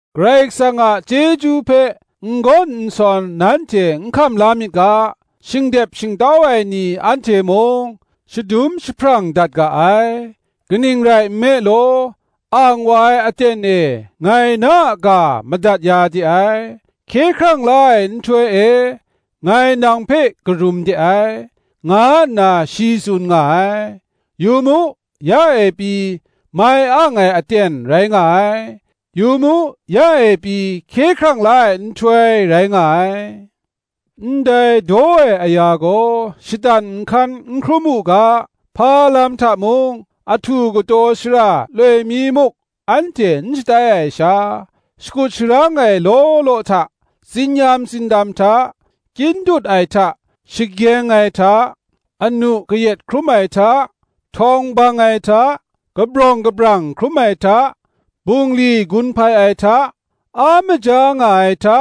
Karai Kasang a chyeju hpe n gawn n sawn nanhte n hkam la myit ga, shingdep shingtau ai ni anhte mung, shadum jahprang dat ga ai. Kaning rai nme law, Ang wa ai aten e ngai na a ga madat ya de ai, Hkye hkrang la ai nhtoi e ngai nang hpe karum de ai, nga nna shi tsun nga ai; yu mu, ya e pyi mai ang ai aten rai nga ai; yu mu, ya e pyi hkye hkrang la ai nhtoi rai nga ai. Ndai daw ai aya gaw shatan nhkan n hkrum u ga, hpa lam hta mung ahtu kataw shara loi mi muk anhte n shatai ai sha, shakut sharang ai law law hta, tsin-yam tsindam hta, kyin dut ai hta, shagyeng ai hta, anu kayat hkrum ai hta, htawng bang ai hta, kabrawng kabrang hkrum ai hta, bungli gun hpai ai hta, a maja nga ai hta,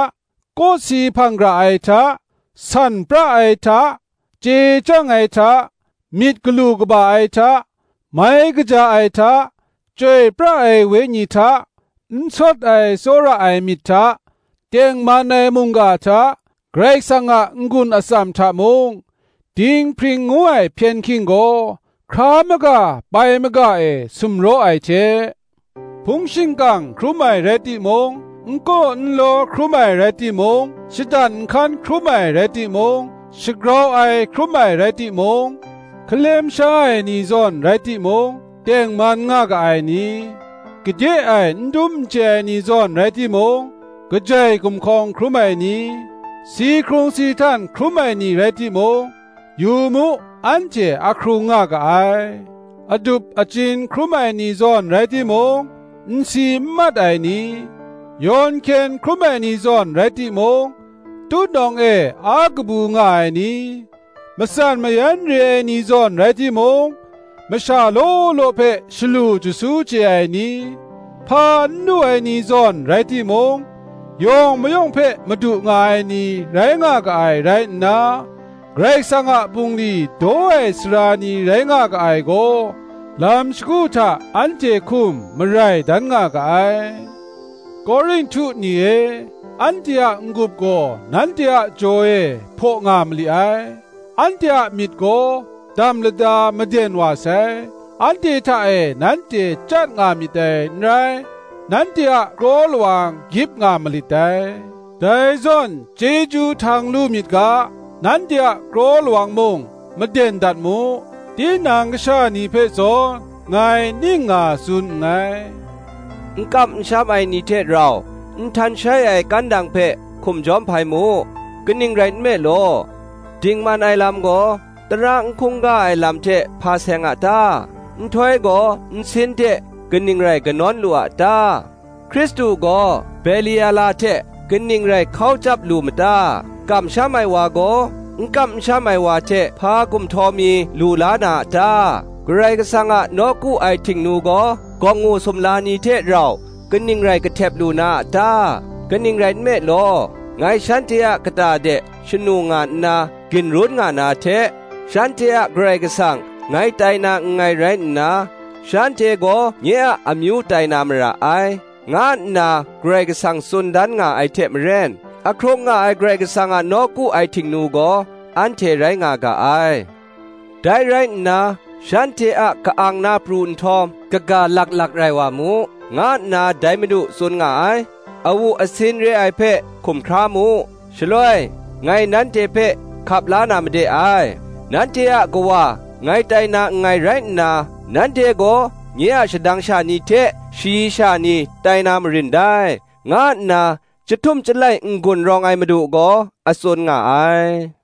kawsi hpang gara ai hta, san pra ai hta, chye chyang ai hta, myit galu kaba ai hta, mai kaja ai hta, Chyoi pra ai Wenyi hta, n sawt ai tsawra ai myit hta, tengman ai mungga hta, Karai Kasang a n-gun atsam hta mung; dinghpring ngu ai hpyen hking gaw hkra maga pai maga e sumraw ai hte, hpung shingkang hkrum ai rai timung, n kaw n law hkrum ai rai timung, shatan nhkan hkrum ai rai timung, shagrau ai hkrum ai rai timung: hkalem sha ai ni zawn rai timung, tengman nga ga ai ni; gade e n dum n chye ai ni zawn rai timung, kajai gumhkawng hkrum ai ni; si hkrung si htan hkrum ai ni rai timung, yu mu, anhte ahkrung nga ga ai; adup achyin hkrum ai ni zawn rai timung, n si n mat ai ni; yawn hkyen hkrum ai ni zawn rai timung, tutnawng e a kabu nga ai ni; matsan mayan re ai ni zawn rai timung, masha law law hpe shalu jasu chye ai ni; hpa n lu ai ni zawn rai timung, yawng mayawng hpe madu nga ai ni rai nga ga ai rai nna, Karai Kasang a bungli daw ai sara ni rai nga ga ai gaw, lam shagu hta anhte hkum marai dan nga ga ai. Korinhtu ni e, anhte a n-gup gaw nanhte a jaw e hpaw nga mali ai, anhte a myit gaw dam lada maden wa sai. Anhte hta e nanhte chyat nga myit dai n rai; nanhte a kraw lawang gyip nga malit dai. Dai zawn chyeju htang lu myit ga, nanhte a kraw lawang mung maden dat mu: tinang kasha ni hpe zawn ngai ning nga tsun nngai. N kam n sham ai ni hte rau nhtan shai ai kandang hpe hkum jawm hpai mu: kaning rai nme law, dingman ai lam gaw, tara n hkungga ai lam hte hpa seng a ta? Nhtoi gaw nsin hte kaning rai kanawn lu a ta? Hkristu gaw Beliala hte kaning rai hkau chyap lu ma ta? Kamsham ai wa gaw, n kam n sham ai wa hte hpa gumhtaw mi lu la na a ta? Karai Kasang a nawku ai htingnu gaw, gawngngu sumla ni hte rau kaning rai kahtep lu na a ta? Kaning rai nme law, Ngai shanhte a kata de shanu nga nna ginrun nga na hte, Shanhte a Karai Kasang ngai tai na nngai rai nna, Shanhte gaw nye a amyu tai na mara ai, nga nna Karai Kasang tsun dan nga ai hte maren, ahkrung nga ai Karai Kasang a nawku ai htingnu gaw, anhte rai nga ga ai. Dai rai nna, Shanhte a ka-ang na pru nhtawm, Kaga lak lak rai wa mu, nga nna dai Madu tsun nga ai. Awu asin re ai hpe hkum hkra mu, Shaloi ngai nanhte hpe hkap la na made ai. Nanhte a Kawa ngai tai na nngai rai nna, Nanhte gaw nye a shadang sha ni hte shayi sha ni tai na marin dai, nga nna chyahtum chyalai n-gun rawng ai Madu gaw a tsun nga ai.